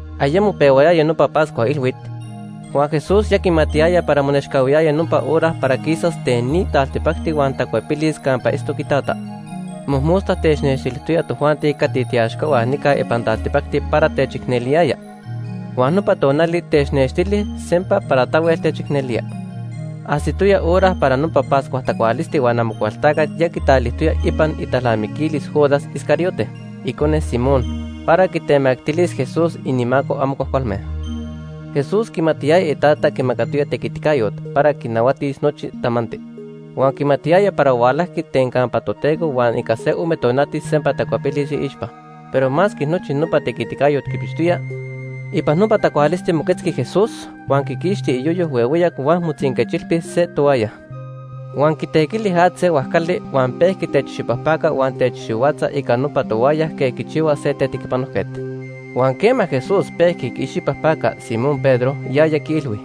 Ayemo pehuayaya nopa Pascua Ilhuit, huan Jesús ya quimatiyaya para monechcahuiyaya nopa hora para quisas ten ni taltipacti huan tacuepilis campa itztoc iTata. Mojmosta technextilijtoya tojuanti cati tiiaxcahua nica ipan taltipacti para techicneliyaya, huan nopa tonali technextili sempa para tahuel techicnelía. Ajsitoya hora para nopa Pascua tacualisti huan Amocualtacat ya quitalilijtoya ipan italnamiquilis Judas Iscariote, icone Simón, para quitemactilis Jesús inimaco amo cuajcualme. Jesús quimatiyaya iTata quimacatoya tequiticayot para quinahuatis nochi tamanti. Huan quimatiyaya para hualajqui ten campa Toteco huan ica se ome tonati sempa tacuepilis iixpa. Pero masque nochi nopa tequiticayot quipixtoya; ipan nopa tacualisti moquetzqui Jesús, huan quiquixti iyoyo huehueyac huan motzinquechilpi se toaya. Huan quitequili at se huajcali, huan pejqui techicxipajpaca huan techicxihuatza ica nopa toaya quej quichihua se tetequipanojquet. Huan quema Jesús pehua quiicxipajpaca Simón Pedro, yaya quiilhui: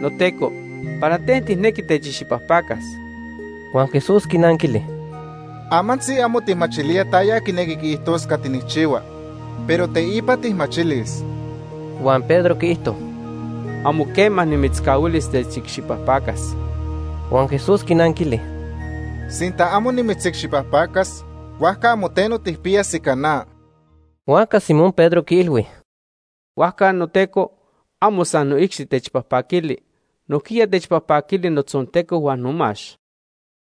―NoTeco, ¿para ten tijnequi techicxipajpacas? Huan Jesús quinanquili: ―Amantzi amo tijmachilía taya quinequi quiijtos cati nijchihua, pero teipa tijmachilis. Huan Pedro quiijto: ―Amo quema nimitzcahuilis techicxipajpacas. Huan Jesús quinanquili: ―Sinta amo nimitzicxipajpacas, huajca amo teno tijpiyas ica na. Huajca Simón Pedro quiilhui: ―Huajca, noTeco, amo san noicxi techpajpaquili, nojquiya techpajpaquili notzonteco huan nomax.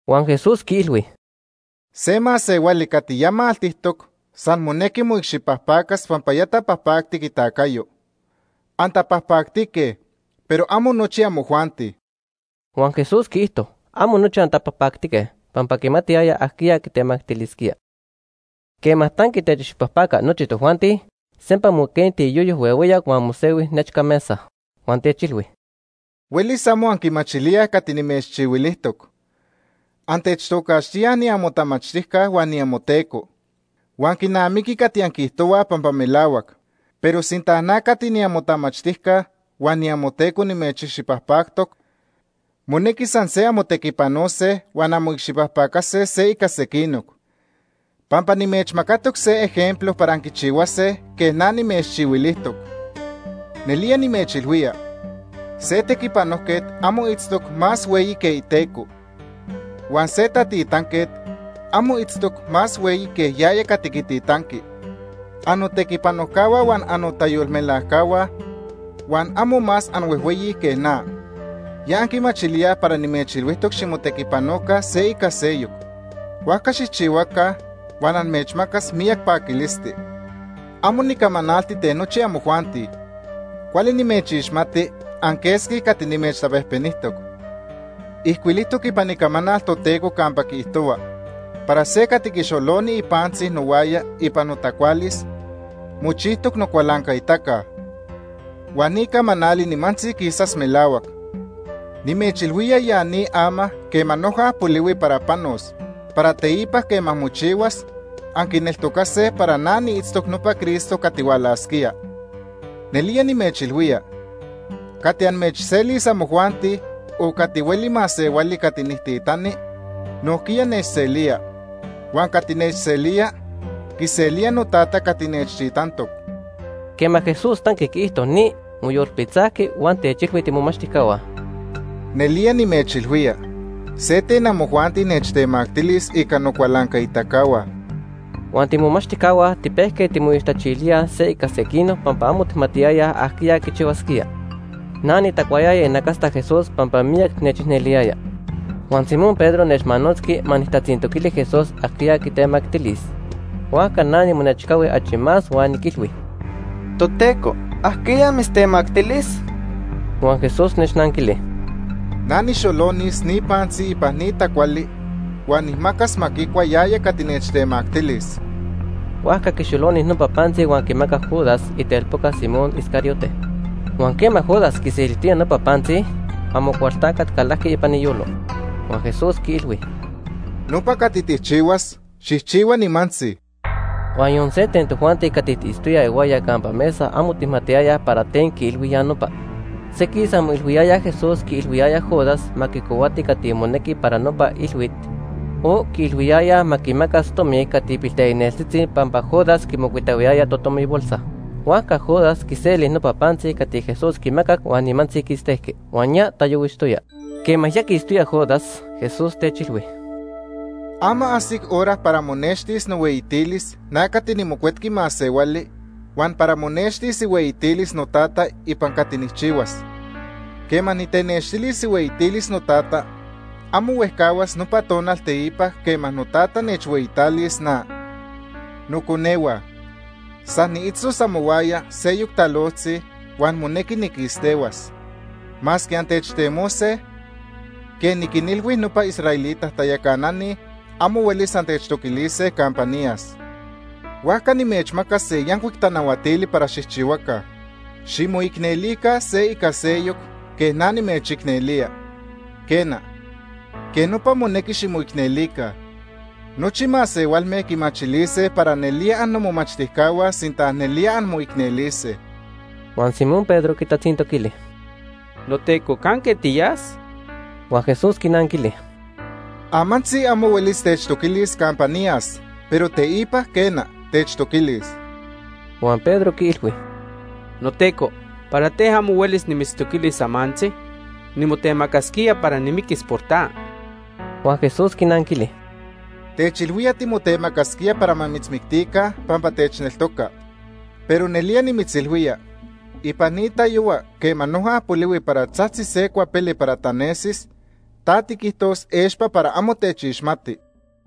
Huan Jesús quiilhui: ―Se masehuali cati maltijtoc san monequi cati quiicxipajpacas pampa ya tapajpactic itacayo. Antapajpactique, pero amo nochi amojuanti. Huan Jesús quiijto: “Amo nochi antapajpactique”, pampa quimatiyaya ajquiya quitemactilisquía. Quema tanqui techicxipajpaca nochi tojuanti, sempa moquenti iyoyo huehueyac huan mosehui nechca mesa. Huan techilhui: ―Huelis amo anquimachilíaj cati nimechchihuilijtoc. Antechtocaxtíaj niamotamachtijca huan niamoTeco. Huan quinamiqui cati anquiijtohuaj pampa melahuac. Pero sinta na cati niamotamachtijca huan niamoTeco nimechicxipajpactoc, monequi san se anmotequipanose huan anmoicxipajpacase se ica sequinoc. Pampa nimechmacatoc se taquejquetzcayot para anquichihuase quej na nimechchihuilijtoc. Nelía nimechilhuía, se tequipanojquet amo itztoc más hueyi que iteco. Huan se tatitanquet amo itztoc más hueyi que yaya cati quititanqui. Annotequipanojcahua huan annotayolmelajcahua huan amo más anhuejhueyi que na. Ya anquimachilíaj para nimechilhuijtoc ximotequipanoca se ica seyoc, huajca xijchihuaca huan amechmacas miyac paquilisti. “Amo nicamanalti ten nochi amojuanti. Cuali nimechixmati anquesqui cati nimechtapejpenijtoc. Ijcuilijtoc ipan Icamanal Toteco campa quiijto para se cati quixoloni ipantzi nohuaya ipan notacualis, mochijtoc nocualancaitaca. Huan ni camanali nimantzi quisas melahuac. Nimechilhuía ya ni ama quema noja polihui para panos, para teipa quema mochihuas, anquineltocase para na niitztoc nopa Cristo cati hualasquía. Nelía nimechilhuía, cati amechselis amojuanti o cati hueli masehuali cati nijtitani, nojquiya nechselía. Huan cati nechselía, quiselía noTata cati nechtitantoc.” Quema Jesús tanqui quiijto ni, moyolpitzajqui huan techilhui tiimomachtijcahua: ―Nelía nimechilhuía, se ten amojuanti nechtemactilis ica nocualancaitacahua. Huan tiimomachtijcahua tipejque timoixtachilíaj se ica sequinoc pampa amo tijmatiyayaj ajquiya quichihuasquía. Na nitacuayaya inacasta Jesús pampa miyac nechicneliyaya. Huan Simón Pedro nechmanotzqui ma nijtatzintoquili Jesús ajquiya quitemactilis. Huajca na nimonechcahui achi más huan niquilhui: ―Toteco, ¿ajquiya mitztemactilis? Huan Jesús nechnanquili: ―Na nijxolonis ni pantzi ipan ni tacuali huan nijmacas ma quicua yaya cati nechtemactilis. Huajca quixoloni nopa pantzi huan quimacac Judas, itelpoca Simón Iscariote. Huan quema Judas quiselijtoya nopa pantzi, Amocualtacat calajqui ipan iyolo. Huan Jesús quiilhui: ―Nopa cati tijchihuas, xijchihua nimantzi. Huan yon se ten tojuanti cati tiitztoyaj ihuaya campa mesa amo tijmatiyayaj para ten quiilhui ya nopa. Sequij san moilhuiyayaj Jesús quiilhuiyaya Judas ma quicohuati cati monequi para nopa ilhuit o quiilhuiyaya ma quinmacas tomi cati pilteicneltzitzi pampa Judas quimocuitahuiyaya totomibolsa. Huajca Judas quiseli nopa pantzi cati Jesús quimacac huan nimantzi quistejqui. Huan ya tayohuixtoya. Quema ya quistoya Judas, Jesús techilhui: ―Ama ajsic hora para monextis nohueyitilis na cati niMocuetqui Masehuali huan para monextis ihueyitilis noTata ipan cati nijchihuas. Quema nitenextilis ihueyitilis noTata, amo huejcahuas nopa tonal teipa quema noTata nechhueyitalis na. Noconehua, san niitztos amohuaya seyoc talojtzi huan monequi niquistehuas. Masque antechtemose, quej niquinilhui nopa israelita tayacanani, amo huelis antechtoquilise campa niyas. Huajca nimechmaca se yancuic tanahuatili para xijchihuaca: Ximoicnelica se ica seyoc quej na nimechicnelía. Quena, quej nopa monequi ximoicnelica. Nochi masehualme quimachilise para nelía annomomachtijcahua sinta nelía anmoicnelise. Huan Simón Pedro quitatzintoquili: ―NoTeco, ¿canque tiyas? Huan Jesús quinanquili: ―Amantzi amo huelis techtoquilis campa niyas, pero teipa quena, techtoquilis. Huan Pedro quiilhui: ―NoTeco, ¿para ten amo huelis nimitztoquilis amantzi? Nimotemacasquía para nimiquis por ta. Huan Jesús quinanquili: ―Techilhuía timotemacasquía para ma mitzmictica pampa techneltoca. Pero nelía nimitzilhuía, ipan ni tayohua quema noja polihuis para tzajtzis se cuapele para tanesis, ta tiquijtojtos expa para amo techixmati.